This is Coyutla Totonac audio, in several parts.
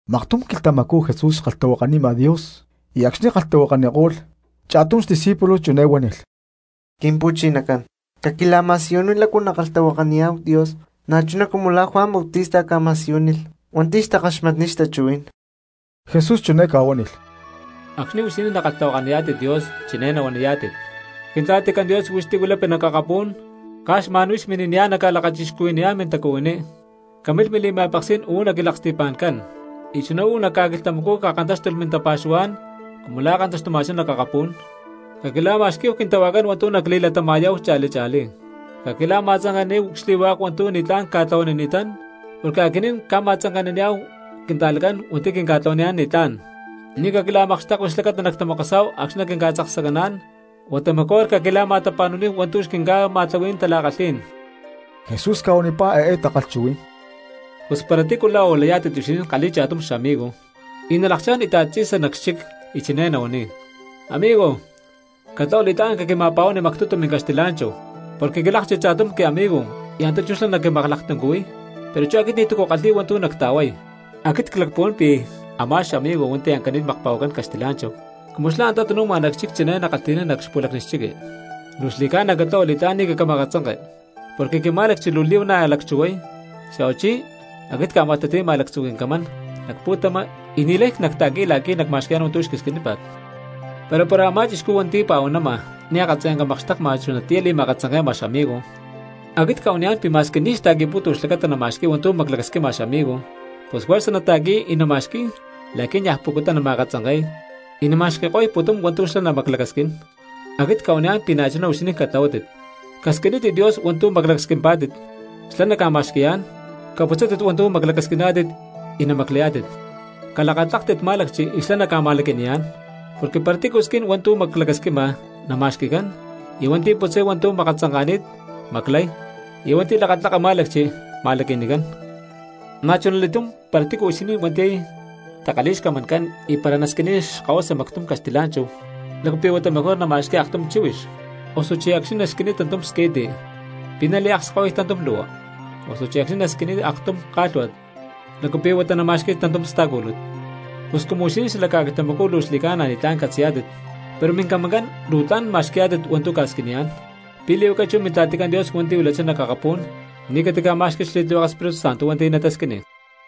Maktum quilhtamacú Jesús xkalhtahuakanima Dios y acxni̠ kalhtahuakako̠lh cha̠tum xdiscípulo chiné huánilh: —Quimpu̠chinacán, caquila̠ma̠siyuníhu lácu nackalhtahuakaniyá̠hu Dios na̠chuná cumu la̠ Juan Bautista ca̠ma̠siyúnilh hua̠nti̠ xtakaxmatniy xtachuhuí̠n. Jesús chiné ca̠huánilh: —Acxni̠ huixinín nakalhtahuakaniyá̠tit Dios chiné nahuaniyá̠tit: Quintla̠ticán Dios hua̠nti̠ huix huilapi nac akapú̠n, caj xma̠n huix mini̠niyá̠n nacca̠lakachixcuhui̠niyá̠n mintacuhuiní. Camilh mili̠ma̠peksí̠n uú nac cquilaksti̠pa̠ncán. Y chuná uú nac ca̠quilhtamacú cakantáxtulh mintapa̠xuhuá̠n cumu la̠ kantaxtuma̠chá nac akapú̠n. Caquila̠ma̠xquí̠hu quintahuajcán hua̠ntu̠ nacli̠latama̠yá̠hu cha̠li cha̠lí. Caquila̠ma̠tzanke̠naníhu xli̠hua̠k hua̠ntu̠ ni̠tlá̠n cca̠tlahuanini̠tán, porque aquinín na̠ cca̠ma̠tzanke̠naniyá̠hu quinta̠cristianojcán hua̠nti̠ quinca̠tlahuaniyá̠n ni̠tlá̠n. Ni̠ caquila̠makxtekui xlacata natamokosá̠hu acxni̠ naquinca̠tzaksacaná̠n huata mejor caquila̠ma̠tapa̠nu̠níhu hua̠ntu̠ xquinca̠ma̠tlahuí̠n tala̠kalhí̠n. Jesús ca̠huanipá eé takalhchuhuí̠n: —Pus para tícu la̠ uú layá̠tit huixinín kalhi̠y cha̠tum xamigo, y nalakchá̠n íta̠t tzi̠sa nac xchic y chiné nahuaniy: “Amigo, catlahua li̠tlá̠n caquima̠pa̠huani mactutu mincaxtila̠nchahu, porque quilákchilh cha̠tum quiamigo y antá chú xlá naquimaklaktuncuhuiy, pero chú aquit ni̠tu̠cu ckalhi̠y hua̠ntu̠ nacta̠huay.” Aquit clacpuhuán pi̠ a̠má xamigo hua̠nti̠ ancani̠t makpa̠huacán caxtilá̠nchahu, cumu xlá antá tanu̠ma nac xchic chiné nakalhti̠nán nac xpu̠lacni chiqui: “Luu xli̠cána catlahua li̠tlá̠n ni̠ caquima̠katzanke, porque quimá̠lacchi luu li̠huana̠ lacchuhuay, xa̠huachí aquit cca̠ma̠lhtati̠ma lactzu̠ quincamán nac pu̠tama y ni̠lay nacta̠qui̠y la̠qui̠ nacma̠xqui̠yá̠n hua̠ntu̠ huix quisquinípa̠t.” Pero para a̠má chixcú hua̠nti̠ pa̠huanama ni̠ akatzayanca makxteka chunatiyá li̠makatzanke̠ma xamigo, aquit cca̠huaniyá̠n pi̠ ma̠squi ni̠ xta̠qui̠pútu xlacata nama̠xqui̠y hua̠ntu̠ maclacasquima xamigo, pus juerza nata̠qui̠y y nama̠xqui̠y la̠qui̠ niaj pucutá nama̠katzanke̠y, y nama̠xqui̠ko̠y pu̠tum hua̠ntu̠ xlá namaclacasquín. Aquit cca̠huaniyá̠n pi̠ na̠chuná huixinín catlahuátit: Casquinítit Dios hua̠ntu̠ maclacasquimpá̠tit, xlá naca̠ma̠xqui̠yá̠n; caputzátit hua̠ntu̠ maclacasquiná̠tit y namaclayá̠tit; calakatláktit má̠lacchi y xlá naca̠ma̠laqui̠niyá̠n. Porque para tícu squin hua̠ntu̠ maclacasquima, nama̠xqui̠cán; y hua̠nti̠ putzay hua̠ntu̠ makatzanka̠ni̠t, maclay; y hua̠nti̠ lakatlaka má̠lacchi, ma̠laqui̠nicán. ’Na̠chunali̠túm para tícu huixinín hua̠nti̠ takalhi̠y xcamancán y para nasquiniy xkahuasa mactum caxtilá̠nchahu, ¿lácu pi̠ huata mejor nama̠xqui̠y aktum chíhuix? Osuchí acxni̠ nasquiniy tantum squi̠ti, ¿pi̠ naliakskahuiy tantum lu̠hua? Osuchí acxni̠ nasquiniy aktum ká̠lhua̠t, ¿lácu pi̠ huata nama̠xqui̠y tantum sta̠cúlut? Pus cumu huixinín xala ca̠quilhtamacú luu xli̠ca̠na ni̠tlá̠n catzi̠yá̠tit, pero mincamancán luu tla̠n ma̠xqui̠yá̠tit hua̠ntu̠ ca̠squiniyá̠n, ¿pi̠ li̠huaca chú Mintla̠ticán Dios hua̠nti̠ huilachá nac akapú̠n ni̠ catica̠má̠xqui̠lh xli̠tlihueke Espíritu Santo hua̠nti̠ natasquiniy?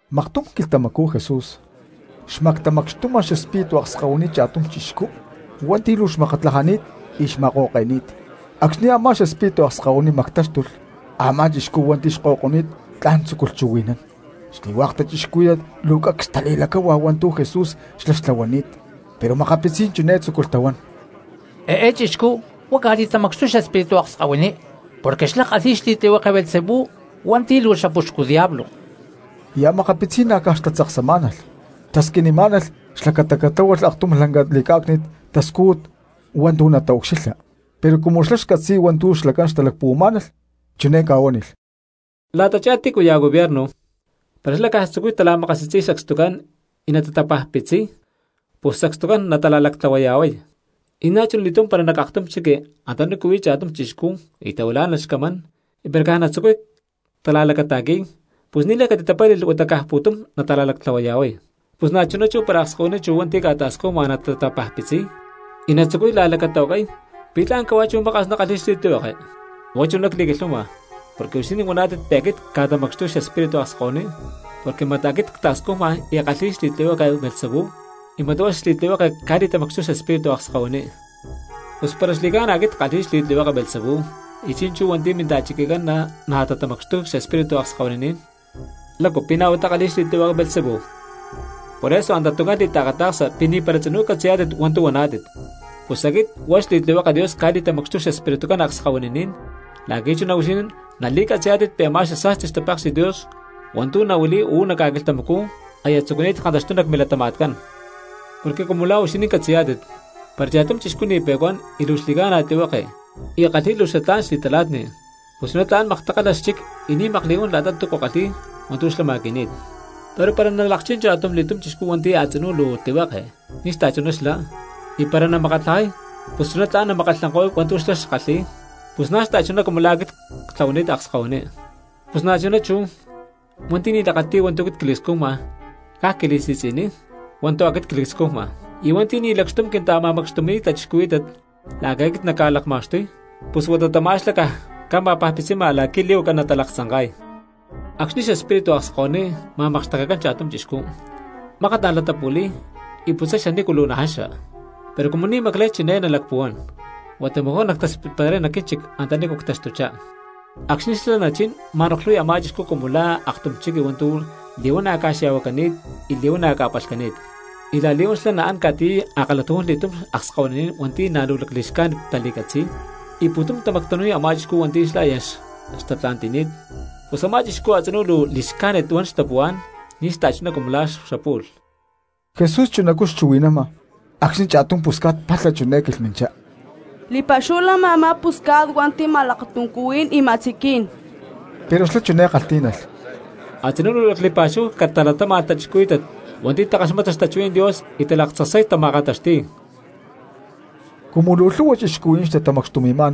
Maktum quilhtamacú Jesús xmactamacxtuma xespíritu akskahuiní cha̠tum chixcú hua̠nti̠ luu xmakatlajani̠t y xma̠ko̠ke̠ni̠t. Acxni̠ a̠má xespíritu akskahuiní mactáxtulh, a̠má chixcú hua̠nti̠ xko̠ko̠ni̠t tla̠n tzúculh chuhui̠nán. Xli̠hua̠k cristianos luu cacs tali̠lacáhua hua̠ntu̠ Jesús xlá xtlahuani̠t, pero makapitzí̠n chiné tzúculh tahuán: —Eé chixcú huá ca̠li̠tamacxtuy xespíritu akskahuiní porque xlá kalhi̠y xli̠tlihueke Beelzebú hua̠nti̠ luu xapuxcu diablo. Y a̠makapitzí̠n na̠ caj xtatzaksamá̠nalh xtasquinimá̠nalh xlacata catláhualh aktum lanca li̠cá̠cni̠t tascújut hua̠ntu̠ nataucxilha. Pero cumu xlá xcatzi̠y hua̠ntu̠ xlacán xtalacpuhuamá̠nalh chiné ca̠huánilh: —La̠tachá tícuya̠ gobierno, para xlá caj tzucuy tala̠makasi̠tzi̠y sacstucán y natatapajpitziy, pus sacstucán natala̠lactlahuaya̠huay. Y na̠chuna li̠túm para nac aktum chiqui antanícu huí cha̠tum chixcú y tahuilá̠nalh xcamán y para caj natzucuy tala̠lacata̠qui̠y pus ni̠lay catitapálhi̠lh huata caj pu̠tum nala̠lactlahuaya̠huay. Pus na̠chuná chú para akskahuiní chu hua̠nti̠ ca̠ta̠scujma natatapajpitziy y natzucuy la̠lacatahuacay, ¿pi̠ tla̠n cahuá chú maka̠s nakalhi̠y xli̠tlihueke? Huá chuná cli̠quilhuama porque huixinín huaná̠tit pi̠ aquit cca̠tamacxtuy xespíritu akskahuiní porque mat aquit cta̠scujma y ckalhi̠y xli̠tlihueke Beelzebú y mat huá xli̠tlihueke cca̠li̠tamacxtuy xespíritu akskahuiní. Pus para xli̠ca̠na aquit ckalhi̠y xli̠tlihueke Beelzebú, y chi̠nchú hua̠nti̠ minta̠chiquicán na̠ tatamacxtuy xespiritucán akskahuininí̠n, ¿lácu pi̠ na̠ huá takalhi̠y xli̠tlihueke Beelzebú? Poreso antatuncán li̠taakata̠ksa pi̠ ni̠para tzinú catzi̠yá̠tit hua̠ntu̠ huaná̠tit. Pus aquit huá xli̠tlihueke Dios cca̠li̠tamacxtuy xespiritucán akskahuininín la̠qui̠ chuná huixinín nali̠catzi̠yá̠tit pi̠ a̠má xasa̠sti xtapéksi̠t Dios hua̠ntu̠ nahuili̠y uú nac ca̠quilhtamacú aya tzucuni̠t kantaxtuy nac milatama̠tcán. ’Porque cumu la̠ huixinín catzi̠yá̠tit, para cha̠tum chixcú ni̠ pe̠cuán y luu xli̠ca̠na tlihueke y kalhi̠y luu xatlá̠n xli̠tala̠tni pus chuná tla̠n maktakalha xchic y ni̠ makli̠huán la̠ta túcu kalhi̠y hua̠ntu̠ xlá ma̠qui̠ni̠t. Pero para nalakchín cha̠tumli̠túm chixcú hua̠nti̠ a̠tzinú luu tlihueke ni̠ xachuná xlá, y para namakatlajay pus chuná tla̠n namakkalhankóy hua̠ntu̠ xlá xkalhi̠y; pus na̠ xta̠chuná cumu la̠ aquit ctlahuani̠t akskahuiní. ’Pus na̠chuná chú, hua̠nti̠ ni̠ lakati̠y hua̠ntu̠ cli̠scujma caj quilaksi̠tzi̠niy hua̠ntu̠ aquit cli̠scujma, y hua̠nti̠ ni̠ lacxtum quinta̠ma̠macxtumi̠y cristianos la̠qui̠ aquit nacca̠lakma̠xtuy, pus huata tamá xlá caj ca̠ma̠pajpitzima la̠qui̠ li̠huaca natalaktzanka̠y. ’Acxni̠ xespíritu akskahuiní ma̠makxtekecán cha̠tum chixcú, mákat an latapu̠li̠y y lacaputzay xanícu luu najaxa; pero cumu ni̠ namaclay chiné nalacpuhuán: “Huata mejor nactaspitparay nac quínchic antanícu ctaxtuchá.” Acxni̠ xlá nachín ma̠noklhuy a̠má chixcú cumu la̠ aktum chiqui hua̠ntu̠ li̠huana̠ ca̠xya̠huacani̠t y li̠huana̠ ca̠palhcani̠t. Y la̠li̠huán xlá naán ca̠tiyay a̠kalhatujún li̠túm akskahuininí̠n hua̠nti̠ na̠ luu lacli̠xcájnit tali̠catzi̠y, y pu̠tum tamactanu̠y a̠má chixcú hua̠nti̠ xlá aya xtatla̠nti̠ni̠t, pus a̠má chixcú a̠tzinú luu li̠xcájnit huan xtapuhuá̠n ni̠ xachuná cumu la̠ xapu̠lh. Jesús chunacú xchuhui̠nama acxni̠ cha̠tum pusca̠t palha chiné quilhminchá: —¡Li̠pa̠xúhu lama a̠má pusca̠t hua̠nti̠ ma̠lakatuncuhuí̠n y ma̠tziquí̠n! Pero xlá chiné kalhtí̠nalh: —Atzinú luu lacli̠pa̠xúhu catalatáma̠lh cristianos hua̠nti̠ takaxmata xtachuhuí̠n Dios y talaktzaksay tama̠kantaxti̠y. Cumu luu lhu̠hua cristianos xtamacxtumi̠ma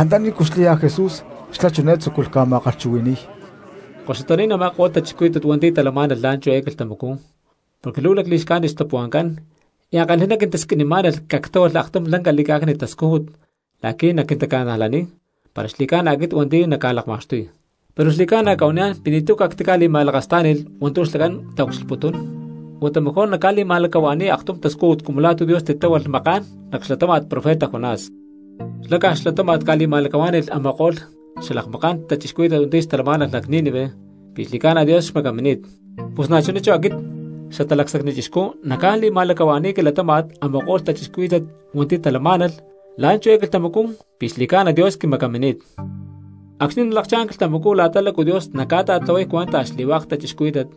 antanícu xláya Jesús xlá chiné tzúculh ca̠ma̠kalhchuhui̠ni̠y: —Koxutaní̠n a̠ma̠ko̠lh cristianos hua̠nti̠ talamá̠nalh la̠nchú eé quilhtamacú porque luu lacli̠xcájnit xtapuhua̠ncán, y ankalhi̠ná quintasquinimá̠nalh cactláhualh aktum lanca li̠cá̠cni̠t tascújut la̠qui̠ naquintali̠ca̠najlaniy para xli̠cána aquit hua̠nti̠ naca̠lakma̠xtuy. Pero xli̠ca̠na cca̠huaniyá̠n pi̠ ni̠tu̠ cactica̠li̠ma̠lakastá̠ni̠lh hua̠ntu̠ xlacán taucxilhputún, huata mejor nacca̠li̠ma̠lacahua̠ni̠y aktum tascújut cumu la̠ tu̠ Dios titláhualh maká̠n nac xlatáma̠t profeta Jonás. Xlá caj xlatáma̠t ca̠li̠ma̠lacahuá̠ni̠lh a̠ma̠ko̠lh xalakmaká̠n cristianos hua̠nti̠ xtalamá̠nalh nac Nínive, pi̠ xli̠ca̠na Dios xmacamini̠t; pus na̠chuná chú aquit Xatalacsacni Chixcú nacca̠li̠ma̠lacahua̠ni̠y quilatáma̠t a̠ma̠ko̠lh cristianos hua̠nti̠ talamá̠nalh la̠nchú eé quilhtamacú pi̠ xli̠ca̠na Dios quimacamini̠t. Acxni̠ nalakchá̠n quilhtamacú la̠ta lácu Dios naca̠ta̠tlahuay cuenta xli̠hua̠k cristianos,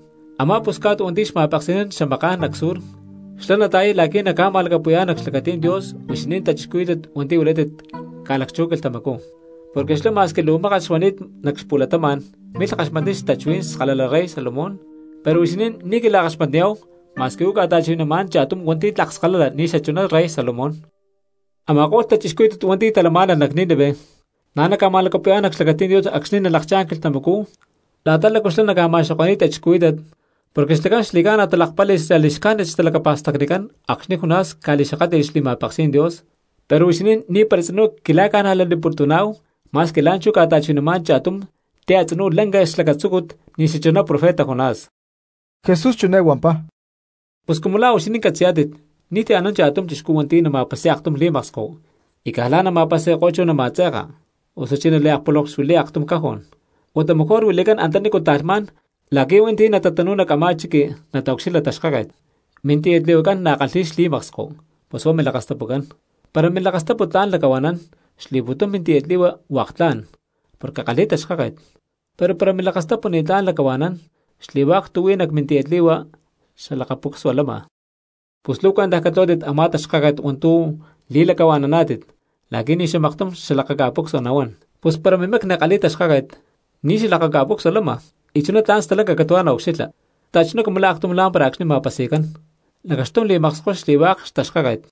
a̠má pusca̠t hua̠nti̠ xma̠peksi̠nán xamaká̠n nac Sur, xlá nata̠yay la̠qui̠ naca̠ma̠lacapu̠yá̠n nac xlacatí̠n Dios huixinín cristianos hua̠nti̠ huilátit ca̠lacchú quilhtamacú; porque xlá ma̠squi luu mákat xuani̠t nac xpu̠latama̠n milh kaxmatniy xtachuhuí̠n skalala rey Salomón, pero huixinín ni̠ quila̠kaxmatniyá̠hu ma̠squi uú ca̠ta̠chuhui̠namá̠n cha̠tum hua̠nti̠ tlak skalala ni̠ xachuná rey Salomón. Ama̠ko̠lh cristianos hua̠nti̠ talamá̠nalh nac Nínive na̠ naca̠ma̠lacapu̠yá̠n nac xlacatí̠n Dios acxni̠ nalakchá̠n quilhtamacú la̠ta lácu xlá naca̠ma̠xoko̠ni̠y cristianos, porque xlacán xli̠ca̠na talakpáli̠lh xali̠xcájnit xtalacapa̠stacnicán acxni̠ Jonás ca̠li̠xakátli̠lh xli̠ma̠peksí̠n Dios, pero huixinín ni̠para tzinú quila̠ca̠najlaniputuná̠hu ma̠squi la̠nchú ca̠ta̠chuhui̠namá̠n cha̠tum ti̠ a̠tzinú lanca xlacatzúcut ni̠ xachuná profeta Jonás. Jesús chiné huampá: —Pus cumu la̠ huixinín catzi̠yá̠tit ni̠ti̠cu anán cristianos hua̠nti̠ nama̠pasi̠y aktum li̠maksko y caj lá nama̠pasi̠ko̠y chú nama̠tze̠ka, osuchí naliakpulonkxuili̠y aktum cajón; huata mejor huili̠cán antanícu ta̠lhmá̠n la̠qui̠ hua̠nti̠ natatanu̠y nac a̠má chiqui nataucxilha taxkáket. Mintiyatli̠huacán na̠ kalhi̠y xli̠maksko pus huá milakastapucán. Para milakastapu tla̠n lacahua̠nán xli̠pu̠tum mintiyatli̠hua hua̠k tla̠n porque kalhi̠y taxkáket, pero para milakastapu ni̠tlá̠n lacahua̠nán xli̠hua̠k tu̠ huí nac mintiyatli̠hua xalakaca̠pucsua lama. Pus luu cuentaj catlahuátit a̠má taxkáket hua̠ntu̠ li̠lacahua̠naná̠tit la̠qui̠ ni̠ xamaktum xalakaca̠pucsua nahuán. Pus para mimacni kalhi̠y taxkáket, ni̠ xalakaca̠pucsua lama, y chuná tla̠n stalanca catu̠huá naucxilha, xta̠chuná cumu la̠ aktum lámpara acxni̠ ma̠pasi̠cán, lacaxtum li̠makskoy xli̠hua̠k xtaxkáket.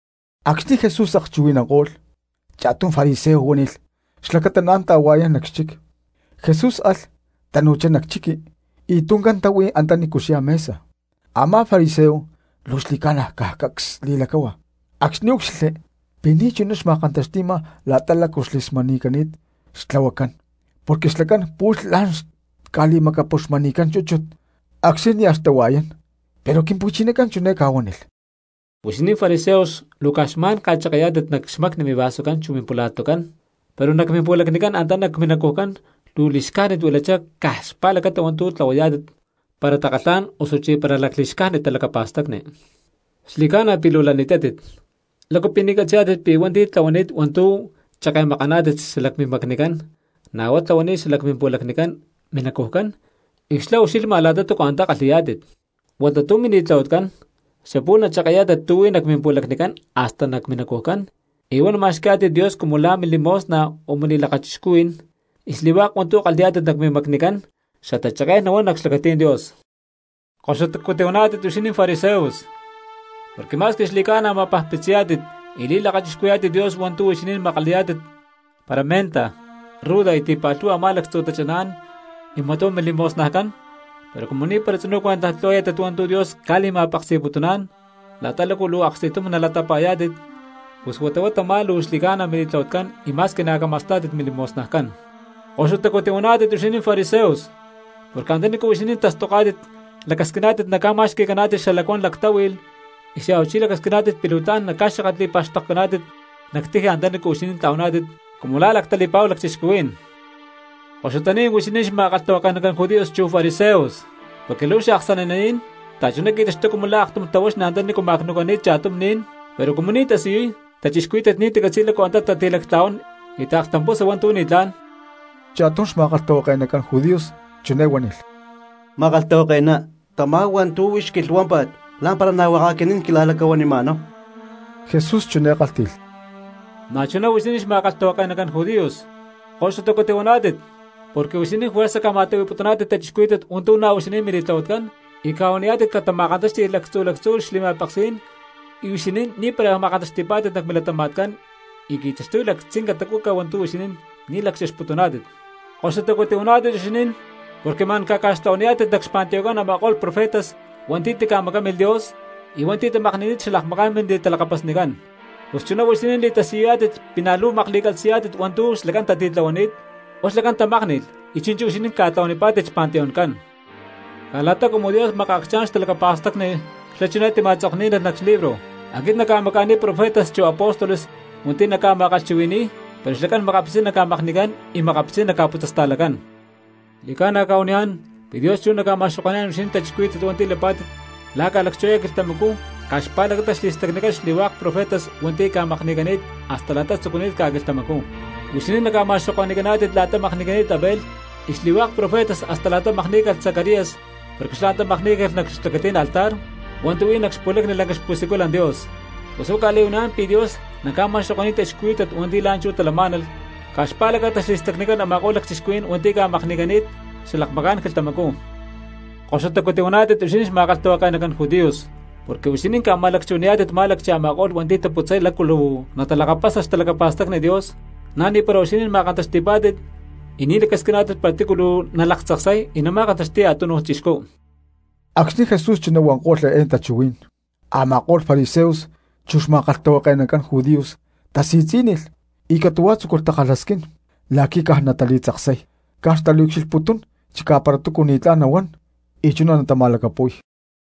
Acxni̠ Jesús akchuhui̠nanko̠lh, cha̠tum fariseo huánilh xlacata naán ta̠hua̠yán nac xchic. Jesús alh, tanu̠chá nac chiqui y tuncán táhui antanícu xyá mesa. Amá fariseo luu xli̠ca̠na caj cacs li̠lacáhua acxni̠ úcxilhli pi̠ ni̠ chuná xma̠kantaxtíma la̠ta lácu xli̠smani̠cani̠t xtlahuacán, porque xlacán pu̠lh la̠n xca̠li̠macapuxmani̠cán chúchut acxni̠ nia̠ tahua̠yán. Pero Quimpu̠chinacán chiné ca̠huánilh: —Huixinín fariseos luu caj xma̠n ca̠cheke̠yá̠tit nac xmacni mivasucán chu mimpula̠tucán, pero nac mimpu̠lacnicán antá nac minacujcán luu li̠xcájnit huilachá caj xpa̠lacata hua̠ntu̠ tlahuayá̠tit para takalhá̠n osuchí para lacli̠xcájnit talacapa̠stacni. Xli̠ca̠na pi̠ luu lani̠tátit, ¿lácu pi̠ ni̠ catzi̠yá̠tit pi̠ hua̠nti̠ tlahuani̠t hua̠ntu̠ cheke̠makaná̠tit xalac mimacnicán na̠ huá tlahuani̠t xalac mimpu̠lacnicán minacujcán y xalá ucxilhma la̠ta túcu antá kalhi̠yá̠tit? Huata tu̠ mili̠tlahuatcán xapu̠lh nacheke̠yá̠tit tu̠ huí nac mimpu̠lacnicán hasta nac minacujcán y huá namacama̠xqui̠yá̠tit Dios cumu la̠ mili̠mosna o mili̠lakachixcuhuí̠n, y xli̠hua̠k hua̠ntu̠ kalhi̠yá̠tit nac mimacnicán xatacheké̠n nahuán nac xlacatí̠n Dios. ’¡Koxutacu tihuaná̠tit huixinín fariseos! Porque ma̠squi xli̠ca̠na ma̠pajpitziyá̠tit y li̠lakachixcuhui̠yá̠tit Dios hua̠ntu̠ huixinín makalayá̠tit para menta, ruda y ti̠pa̠lhu̠hua a̠má lactzu̠ tachaná̠n y mat huá mili̠mosnajcán, pero cumu ni̠para tzinú cuentaj tlahuayá̠tit hua̠ntu̠ Dios ca̠li̠ma̠peksi̠putuná̠n la̠ta lácu luu aksti̠tum nalatapa̠yá̠tit, pus huata huá tamá luu xli̠ca̠na mili̠tlahuatcán y ma̠squi na̠ cama̠stá̠tit mili̠mosnajcán. ’¡Koxutacu tihuaná̠tit huixinín fariseos! Porque antanícu huixinín tastoká̠tit, lacasquiná̠tit naca̠ma̠xqui̠caná̠tit xalacuán lactáhui̠lh, y xa̠huachí lacasquiná̠tit pi̠ luu tla̠n naca̠xakatli̠pa̠xtokcaná̠tit nac tiji antanícu huixinín tla̠huaná̠tit cumu la̠ lactali̠pa̠hu lacchixcuhuí̠n. ’¡Koxutaní̠n huixinín xma̠kalhtahuake̠nacán judíos chu fariseos! Porque luu xaaksani̠naní̠n, xta̠chuná qui̠taxtuy cumu la̠ aktum tahuaxni antanícu ma̠cnu̠cani̠t cha̠tum ni̠n, pero cumu ni̠ tasiyuy, cristianos ni̠ tacatzi̠y lácu antá tati̠lactla̠huán y taaklhtampusa hua̠ntu̠ ni̠tlá̠n. Cha̠tum xma̠kalhtahuake̠nacán judíos chiné huánilh: —Ma̠kalhtahuake̠ná, tamá hua̠ntu̠ huix quilhuámpa̠t lá̠mpara na̠ hua̠k aquinín quila̠lacahuanima̠náhu. Jesús chiné kálhti̠lh: —¡Na̠chuná huixinín xma̠kalhtahuake̠nacán judíos, koxutacu tihuaná̠tit! Porque huixinín juerza ca̠ma̠tlahui̠putuná̠tit cristianos hua̠ntu̠ na̠ huixinín mili̠tlahuatcán, y ca̠huaniyá̠tit catama̠kantáxti̠lh lactzu̠ lactzu̠ xli̠ma̠peksí̠n y huixinín ni̠para ma̠kantaxti̠pá̠tit nac milatama̠tcán y qui̠taxtuy lactzinca tacuca hua̠ntu̠ huixinín ni̠ lacchexputuná̠tit. ’¡Koxutacu tihuaná̠tit huixinín! Porque ma̠n ca̠ca̠xtlahua̠naniyá̠tit nac xpanteoncán a̠ma̠ko̠lh profetas hua̠nti̠ tica̠macámilh Dios, y hua̠nti̠ tamakni̠ni̠t xalakmaká̠n mili̠talakapasnicán. Pus chuná huixinín li̠tasiyuyá̠tit pi̠ na̠ luu makli̠catzi̠yá̠tit hua̠ntu̠ xlacán tatitlahuani̠t; huá xlacán tamákni̠lh y chi̠nchú huixinín ca̠tlahuanipá̠tit xpanteoncán. ’Caj la̠ta cumu Dios makaacchá̠n xtalacapa̠stacni xlá chiné tima̠tzokní̠nalh nac libro: “Aquit nacca̠maca̠niy profetas chu apóstoles hua̠nti̠ naca̠ma̠kalhchuhui̠ni̠y, pero xlacán makapitzí̠n naca̠makni̠cán, y makapitzí̠n naca̠putzasta̠lacán.” Xli̠ca̠na cca̠huaniyá̠n pi̠ Dios chú naca̠ma̠xoko̠ni̠yá̠n huixinín cristianos hua̠nti̠ lapá̠tit la̠ ca̠lacchú eé quilhtamacú caj xpa̠lacata xli̠stacnicán xli̠hua̠k profetas hua̠nti̠ ca̠makni̠cani̠t hasta la̠ta tzucuni̠t ca̠quilhtamacú. Huixinín naca̠ma̠xoko̠ni̠caná̠tit xli̠stacni la̠ta makni̠cani̠t Abel y xli̠hua̠k profetas hasta la̠ta makní̠calh xli̠stacni Zacarías porque xlá antá makní̠calh nac xlacatí̠n a̠má altar hua̠ntu̠ huí nac xpu̠lacni lanca xpu̠siculan Dios. Pus huá cca̠li̠huaniyá̠n pi̠ Dios naca̠ma̠xoko̠ni̠y cristianos hua̠nti̠ la̠nchú talamá̠nalh caj xpa̠lacata xli̠stacnicán hua̠k a̠ma̠ko̠lh lacchixcuhuí̠n hua̠nti̠ ca̠makni̠cani̠t xalakmaká̠n quilhtamacú. ’¡Koxutacu tihuaná̠tit huixinín xma̠kalhtahuake̠nacán judíos! Porque huixinín ca̠ma̠lacchuhuaniyá̠tit má̠lacchi a̠ma̠ko̠lh hua̠nti̠ taputzay lácu luu natalakapasa xtalacapa̠stacni Dios; na̠ ni̠para huixinín ma̠kantaxti̠pá̠tit, y ni̠ lacasquiná̠tit para tícu luu nalaktzaksay y nama̠kantaxti̠y a̠túnuj cristiano. Acxni̠ Jesús chuná huanko̠lh eé tachuhuí̠n, a̠ma̠ko̠lh fariseos chu xma̠kalhtahuake̠naní̠n judíos tasi̠tzí̠nilh y catu̠huá tzúculh takalhasquín la̠qui̠ caj natali̠tzaksay. Caj xtaucxilhputún chicá para túcu ni̠tlá̠n nahuán y chuná natama̠lacapu̠y.